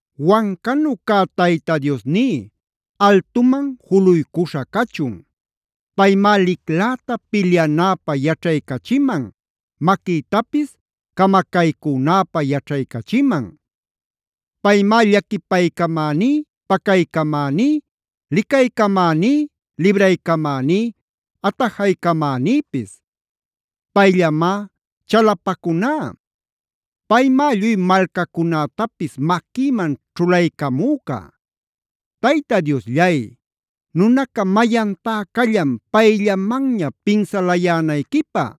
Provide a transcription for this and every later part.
Wancanu cä Tayta Diosní, altuman juluycuśha cachun; paymá licläta pilyanäpä yaćhaycachiman, maquïtapis camacaycünäpä yaćhaycachiman. Paymá llaquipaycamäní, pacaycamäní, licaycamäní, libraycamäní, atajaycamänïpis. Payllamá chalapacuná. Paymá lluy malcacunätapis maquïman ćhulaycamüca. Tayta Diosllay, ¿nunaca mayantá callan payllamanña pinsalayänayquipä?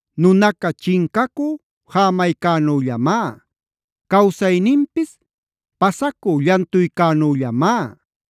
Nunaca chincacü jämaycänüllamá. Cawsayninpis pasacü llantuycänüllamá.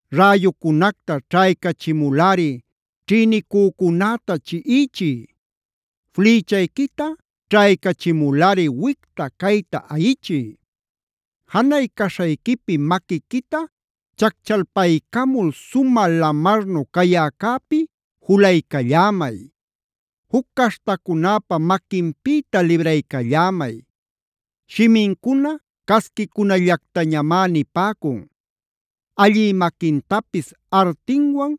Räyucunacta ćhaycachimulꞌari ćhïnicücunäta chiꞌichiy. Flïchayquita ćhaycachimulꞌari wicta-cayta ayichiy. Janay caśhayquipi maquiquita chacchalpaycamul sumä lamarnu cayäcäpi julaycallämay. Juc caśhtacunäpa maquinpïta libraycallämay. Shimincuna casquicunallactañamá nipäcun. Allï maquintapis artinwan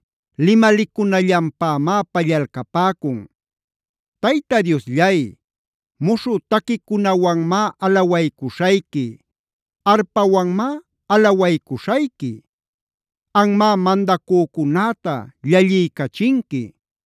limalicunallanpämá pallalcapäcun. Tayta Diosllay, muśhü taquicunawanmá alawaycuśhayqui. Arpawanmá alawaycuśhayqui. Anmá mandacücunäta llalliycachinqui.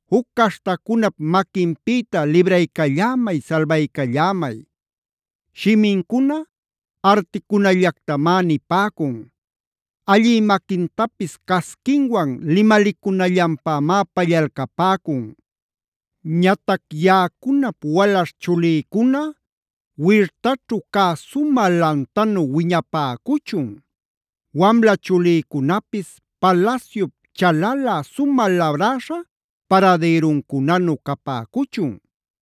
Juc caśhtacunap maquinpïta libraycallämay, salbaycallämay. Shimincuna articunallactamá nipäcun. Allï maquintapis casquinwan limalicunallanpämá pallalcapäcun. Ñatac yaꞌacunap walaśh chulïcuna wirtaćhu cä sumä lantanu wiñapäcuchun. Wamla chulïcunapis palasyup chalalä sumä labräśha paradïruncunanu capäcuchun.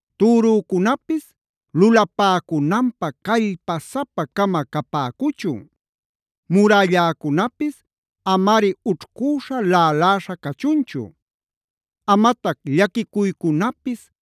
Türücunapis lulapäcunanpä callpasapa-cama capäcuchun. Murälläcunapis amari ućhcüśha, laꞌaläśha cachunchu. Amatac llaquicuycunapis,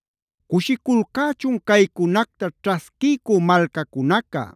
¡Cushiculcächun caycunacta ćhasquiycü malcacunaca!